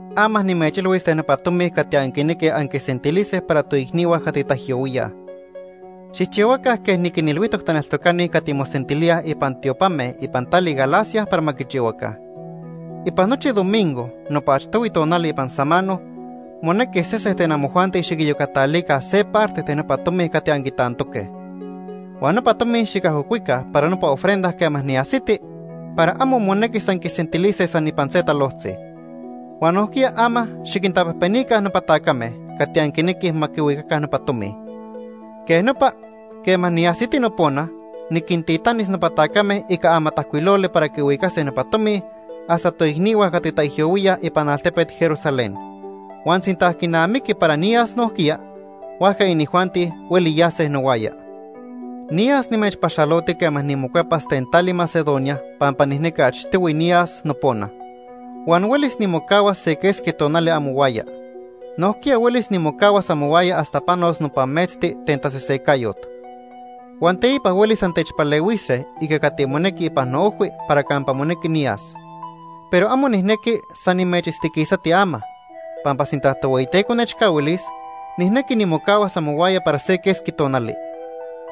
Ama nimechilhuis ten nopa tomi cati anquinequij anquisentilise para toicnihua cati taijyohuíaj. Xijchihuaca quej niquinilhuijtoc taneltocani cati mosentilíaj ipan tiopame ipan tali Galacia para ma quichihuaca. Ipan nochi domingo, nopa achtohui tonali ipan samano, monequi sese ten amojuanti xiquiyocatalica se parte ten nopa tomi cati anquitantoque. Huan nopa tomi xicajocuica para nopa ofrenda quema niajsiti para amo monequis anquisentilise san ipan se talojtzi. Huan nojquiya ama xiquintapejpenica nopa tacame cati anquinequij ma quihuicaca nopa tomi. Quej nopa quema niajsiti nopona, niquintitanis nopa tacame ica amatajcuiloli para quihuicase nopa tomi hasta toicnihua cati taijyohuíaj ipan altepet Jerusalén. Huan sinta quinamiqui para niyas nojquiya, huajca inijuanti hueli yase nohuaya. Niyas nimechpaxaloti quema nimocuepas ten tali Macedonia pampa nijnequi achtohui niyas nopona. Huan huelis nimocahuas se quesqui tonali amohuaya. Nojquiya huelis nimocahuas amohuaya hasta panos nopa metzti ten tasesecayot. Huan teipa huelis antechpalehuise ica cati monequi ipan noojhui para campa monequi niyas. Pero amo nijnequi san nimechitztiquisati ama, pampa sinta Tohueyiteco nechcahuilis, nijnequi nimocahuas amohuaya para se quesqui tonali.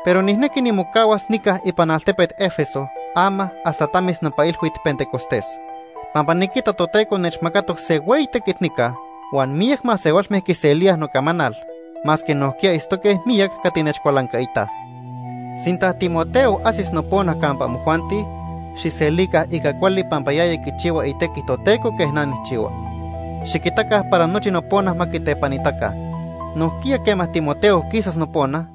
Pero nijnequi nimocahuas nica ipan altepet Éfeso ama hasta tamis nopa Ilhuit Pentecostés. Pampa niquita Toteco nechmacatoc se hueyi tequit nica huan miyac masehualme quiselíaj nocamanal, masque nojquiya itztoque miyac cati nechcualancaitaj. Sinta Timoteo ajsis nopona campa amojuanti, xijselica ica cuali pampa yaya quichihua itequi Toteco quej na nijchihua. Xiquitaca para nochi nopona ma quitepanitaca. Nojquiya quema Timoteo quisas nopona,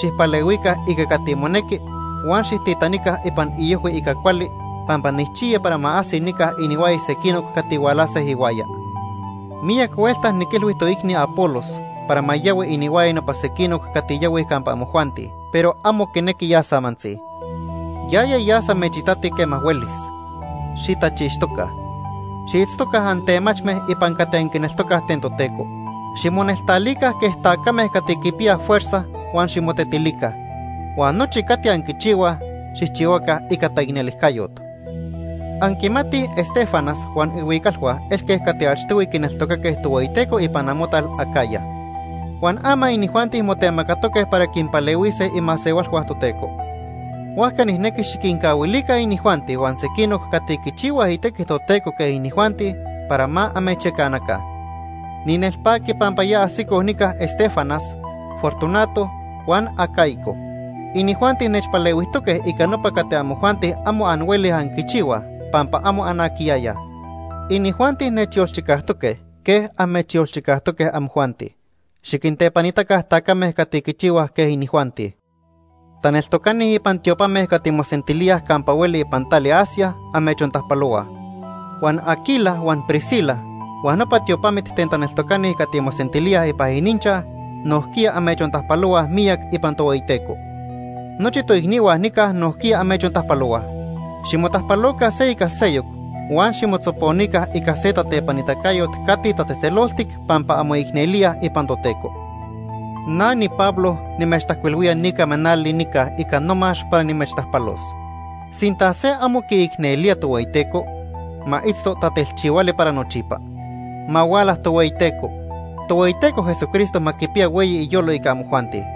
xijpalehuica ica cati monequi huan xijtitanica ipan iojhui ica cuali pampa nijchiya para ma ajsi nica inihuaya sequinoc cati hualase ihuaya. Miyac huelta niquilhui toicni Apolos para ma yahui inihuaya nopa sequinoc cati yahuij campa amojuanti, pero amo quinequi yas amantzi. Yaya yas amechitati quema huelis. Xitachixtoca. Xiitztoca antemachme ipan cati anquineltocaj ten Toteco. Ximoneltalica quej tacame cati quipiyaj fuerza huan ximotetilica. Huan nochi cati anquichihuaj, xijchihuaca ica taicnelijcayot. Anquimatij Estéfanas huan ihuicalhua elque cati achtohui quineltocaque Tohueyiteco ipan amotal Acaya. Huan ama inijuanti motemacatoque para quinpalehuise imasehualhua Toteco. Huajca nijnequi xiquincahuilica inijuanti huan sequinoc cati quichihuaj itequi Toteco quej inijuanti para ma amechyacanaca. Ninelpaqui pampa ya ajsicoj nica Estéfanas, Fortunato, huan Acaico. Inijuanti nechpalehuijtoque ica nopa cati amojuanti amo anhuelij anquichihuaj, pampa amo anaquiyayaj. Inijuanti nechyolchicajtoque quej amechyolchicajtoque amojuanti. Xiquintepanitaca tacame cati quichihuaj quej inijuanti. Taneltocani ipan tiopame cati mosentilíaj campa hueli ipan tali Asia amechontajpalohuaj. Huan Aquila huan Priscila huan nopa tiopamit ten taneltocani cati mosentilíaj ipan ininchaj nojquiya amechontajpalohuaj miyac ipan Tohueyiteco. Nochi toicnihua nica nojquiya amechontajpalohuaj. Ximotajpaloca se ica seyoc huan ximotzoponica ica se tatepanitacayot cati tatzejtzeloltic pampa anmoicnelíaj ipan Toteco. Na niPablo nimechtajcuilhuía ni camanali nica ica nomax para nimechtajpalos. Sinta se amo quiicnelía Tohueyiteco, ma itzto tatelchihuali para nochipa. Ma huala Tohueyiteco. Tohueyiteco Jesucristo ma quipiya hueyi iyolo ica amojuanti.